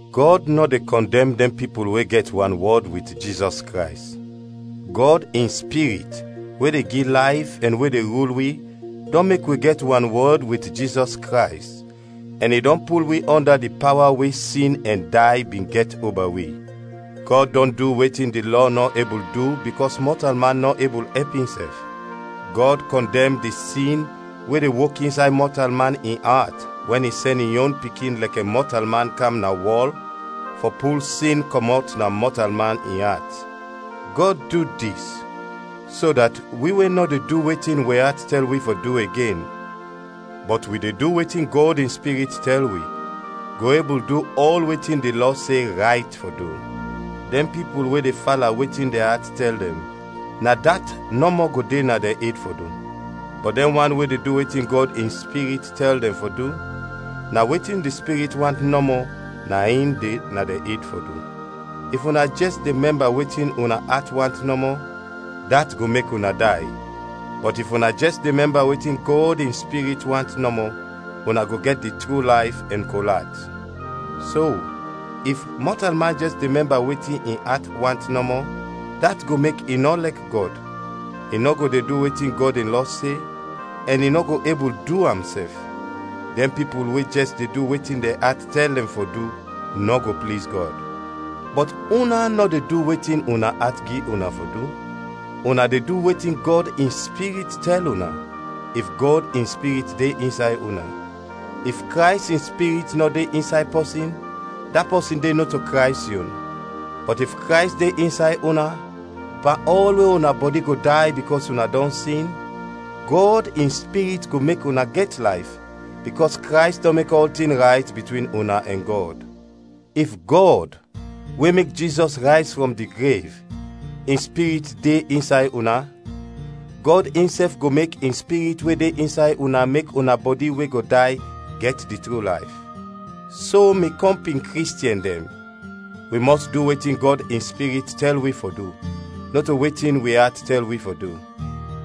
Gɔd nɔ de kɔndɛm dɛn pipul we gɛt wanwɔd wit Jizɔs Krays. Gɔd in Spirit we de gi layf ɛn we de rul wi dɔn mek wi gɛt wanwɔd wit Jizɔs Krays, ɛn i dɔn pul wi ɔnda di pawa we sin ɛn day bin gɛt oba wi. Gɔd dɔn du wetin di Lɔ nɔ ebul du bikɔs mɔtalman nɔ ebul ɛp insɛf. Gɔd kɔndɛm di sin we de wok insay mɔtalman in at wɛn i sɛn in yon Pikin lɛkɛ mɔtalman kam na wɔl fɔ pul sin kɔmɔt na mɔtalman in at. Gɔd du dis so dat wi we nɔ de du wetin wi at tɛl wi fɔ du igen, bɔt wi de du wetin Gɔd in Spirit tɛl wi, go ebul du ɔl wetin di Lɔ se rayt fɔ du. Dɛn pipul we de fala wetin dɛn at tɛl dɛn, na dat nɔmɔ go de na dɛn ed fɔ du; bɔt dɛn wan we de du wetin Gɔd in Spirit tɛl dɛn fɔ du, na wetin di Spirit want nɔmɔ na in de na dɛn ed fɔ du. If una jɛs de mɛmba wetin una at want nɔmɔ, dat go mek una day; bɔt if una jɛs de mɛmba wetin Gɔd in Spirit want nɔmɔ, una go gɛt di tru layf ɛn kol at. So, if mɔtalman jɛs de mɛmba wetin in at want nɔmɔ, dat go mek i nɔ lɛk Gɔd; i nɔ go de du wetin Gɔd in lɔ se, ɛn i nɔ go ebul du am sɛf. Dɛn pipul we jɛs de du wetin dɛn at tɛl dɛn fɔ du, nɔ go pliz Gɔd. Bɔt una nɔ de du wetin una at gi una fɔ du, una de du wetin Gɔd in Spirit tɛl una, if Gɔd in Spirit de insay una. If Krays in Spirit nɔ de insay pɔsin, da pɔsin de nɔto Krays yon. Bɔt if Krays de insay una, pan ɔl we una bɔdi go day bikɔs una dɔn sin, Gɔd in Spirit go mek una gɛt layf, bikɔs Krays dɔn mek ɔltin rayt bitwin una ɛn Gɔd. If Gɔd, we mek Jizɔs rayz frɔm di grev, in Spirit de insay una, Gɔd insɛf go mek in Spirit we de insay una mek una bɔdi we go day gɛt di tru layf. So mi kɔmpin Kristiɛn dɛn, wi mɔs du wetin Gɔd in Spirit tɛl wi fɔ du, nɔto wetin wi at tɛl wi fɔ du.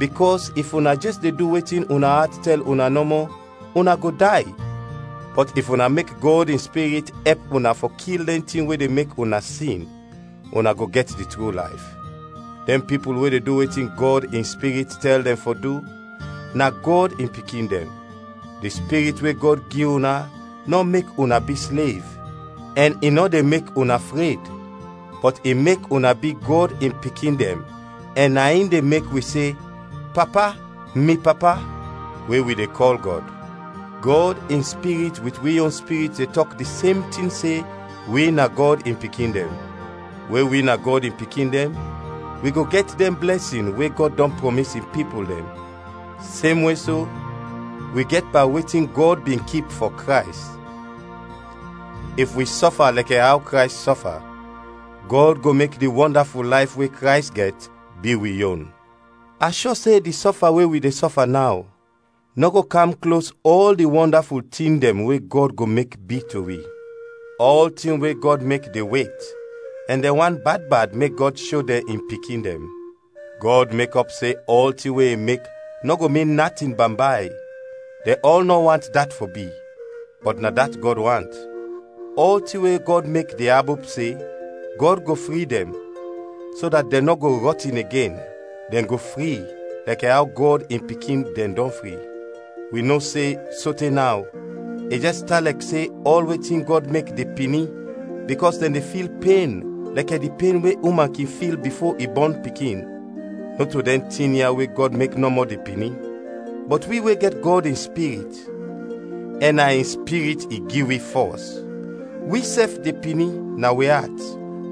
Bikɔs if una jɛs de du wetin una at tɛl una nɔmɔ, una go day, bɔt if una mek Gɔd in Spirit ɛp una fɔ kil dɛn tin we de mek una sin, una go gɛt di tru layf. Dɛn pipul we de du wetin Gɔd in Spirit tɛl dɛn fɔ du, na Gɔd in pikin dɛn. Di Spirit we Gɔd gi una nɔ mek una bi slev ɛn i nɔ de mek una fred, bɔt i mek una bi Gɔd in pikin dɛn ɛn na in de mek wi se, “Papa, mi Papa,” we wi de kɔl Gɔd. Gɔd in Spirit wit wi yon spirit de tɔk di sem tin se wi na Gɔd in pikin dɛn. We wi na Gɔd in pikin dɛn, wi go gɛt dɛn blɛsin we Gɔd dɔn prɔmis in pipul dɛn, semwe so, wi gɛt pan wetin Gɔd bin kip fɔ Krays. If wi sɔfa lɛkɛ aw Krays sɔfa, Gɔd go mek di wɔndaful layf we Krays gɛt bi wi yon. A shɔ se di sɔfa we wi de sɔfa naw, nɔ go kam klos ɔl di wɔndaful tin dɛn we Gɔd go mek bi to wi. Ɔltin we Gɔd mek de wet ɛn dɛn want bad bad mek Gɔd sho dɛn in pikin dɛn. Gɔd mekɔp se ɔltin we i mek nɔ go min natin bambay, dɛn ɔl nɔ want dat fɔ bi, bɔt na dat Gɔd want. Ɔltin we Gɔd mek de abop se, Gɔd go fri dɛn, so dat dɛn nɔ go rɔtin igen, dɛn go fri, lɛkɛ aw Gɔd in pikin dɛn dɔn fri. Wi no se sote naw, i jɛs tan lɛkɛ se ɔl wetin Gɔd mek de pini bikɔs dɛn de fil pen lɛkɛ di pen we uman kin fil bifo i bɔn pikin. Nɔto dɛn tin ya we Gɔd mek nɔmɔ de pini; bɔt wi we gɛt Gɔd in Spirit, ɛn na in Spirit i gi wi fɔs, wisɛf de pini na wi at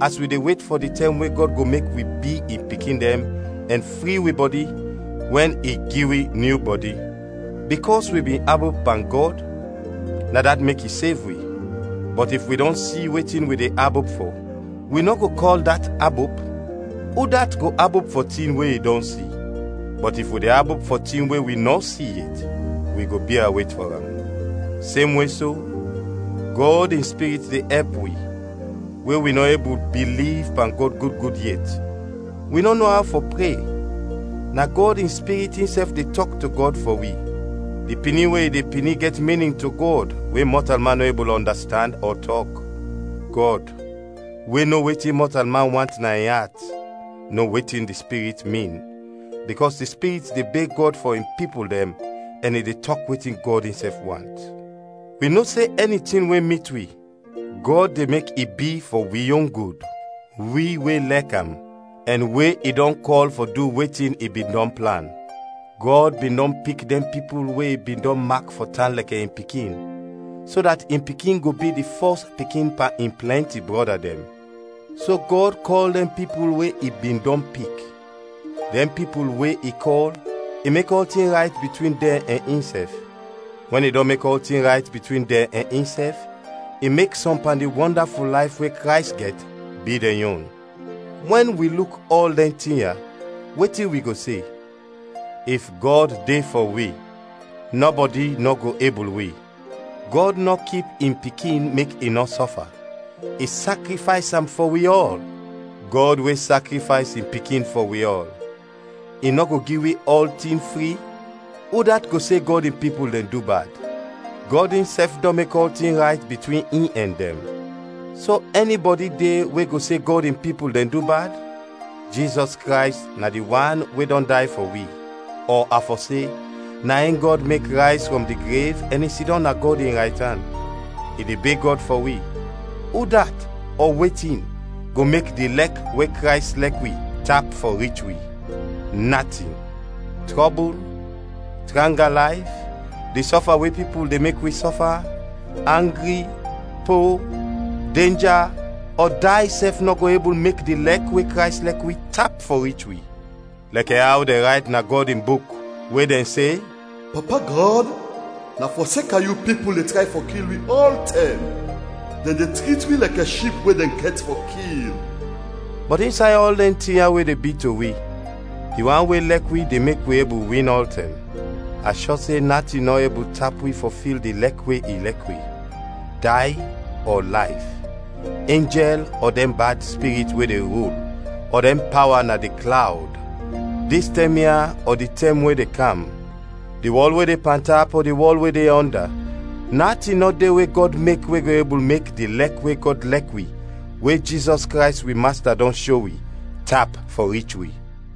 as wi de wet fɔ di tɛm we Gɔd go mek wi bi in pikin dɛn ɛn fri wi bɔdi, wɛn i gi wi nyu bɔdi. Bikɔs wi bin abop pan Gɔd, na dat mek i sev wi. Bɔt if wi dɔn si wetin wi de abop fɔ, wi nɔ go kɔl dat abop. Udat go abop fɔ tin we i dɔn si? Bɔt if wi de abop fɔ tin we wi nɔ si yet, wi go bia wet fɔ am. Semwe so, Gɔd in Spirit de ɛp wi, we wi nɔ ebul biliv pan Gɔd gud gud yet. Wi nɔ no aw fɔ pre, na Gɔd in Spirit insɛf de tɔk to Gɔd fɔ wi; di pini we i de pini gɛt minin to Gɔd we mɔtalman nɔ ebul ɔndastand ɔ tɔk. Gɔd, we no wetin mɔtalman want na in at, no wetin di Spirit min, bikɔs di Spirit de beg Gɔd fɔ in pipul dɛn ɛn i de tɔk wetin Gɔd insɛf want. Wi no se ɛni tin we mit wi, Gɔd de mek i bi fɔ wi yon gud, wi we lɛk am, ɛn we i dɔn kɔl fɔ du wetin i bin dɔn plan. Gɔd bin dɔn pik dɛn pipul we i bin dɔn mak fɔ tan lɛkɛ in Pikin, so dat in Pikin go bi di fɔs pikin pan in plɛnti brɔda dɛn. So Gɔd kɔl dɛn pipul we i bin dɔn pik; dɛn pipul we i kɔl, i mek ɔltin rayt bitwin dɛn ɛn insɛf; wɛn i dɔn mek ɔltin rayt bitwin dɛn ɛn insɛf, i mek sɔm pan di wɔndaful layf we Krays gɛt bi dɛn yon. Wɛn wi luk ɔl dɛn tin ya, wetin wi go se? If Gɔd de fɔ wi, nɔbɔdi nɔ go ebul wi. Gɔd nɔ kip in Pikin mek i nɔ sɔfa, i sakrifays am fɔ wi ɔl! Gɔd we sakrifays in Pikin fɔ wi ɔl, i nɔ go gi wi ɔltin fri? Udat go se Gɔd in pipul dɛn du bad? Gɔd insɛf dɔn mek ɔltin rayt bitwin in ɛn dɛn. So ɛnibɔdi de we go se Gɔd in pipul dɛn du bad? Jizɔs Krays na di wan we dɔn day fɔ wi, ɔ a fɔ se, na in Gɔd mek rayz frɔm di grev ɛn i sidɔm na Gɔd in raytan. I de beg Gɔd fɔ wi. Udat ɔ wetin go mek di lɛk we Krays lɛk wi tap fɔ rich wi? Natin: trɔbul, tranga layf, di sɔfa we pipul de mek wi sɔfa, angri, po, denja, ɔ day sɛf nɔ go ebul mek di lɛk we Krays lɛk wi tap fɔ rich wi. Lɛkɛ aw dɛn rayt na Gɔd in Buk we dɛn se, “Papa Gɔd, na fɔseka yu, pipul de tray fɔ kil wi ɔltɛm; dɛn de trit wi lɛkɛ ship we dɛn gɛt fɔ kil.” Bɔt insay ɔl dɛn tin ya, we de bi to wi, di wan we lɛk wi de mek wi ebul win ɔltɛm. A shɔ se natin nɔ ebul tap wi fɔ fil di lɛk we i lɛk wi: day ɔ layf, enjɛl ɔ dɛn bad spirit we de rul ɔ dɛn pawa na di klawd, dis tɛm ya ɔ di tɛm we de kam; di wɔl we de pantap ɔ di wɔl we de ɔnda natin nɔ de we Gɔd mek we go ebul mek di lɛk we Gɔd lɛk wi we Jizɔs Krays wi Masta dɔn sho wi, tap fɔ rich wi.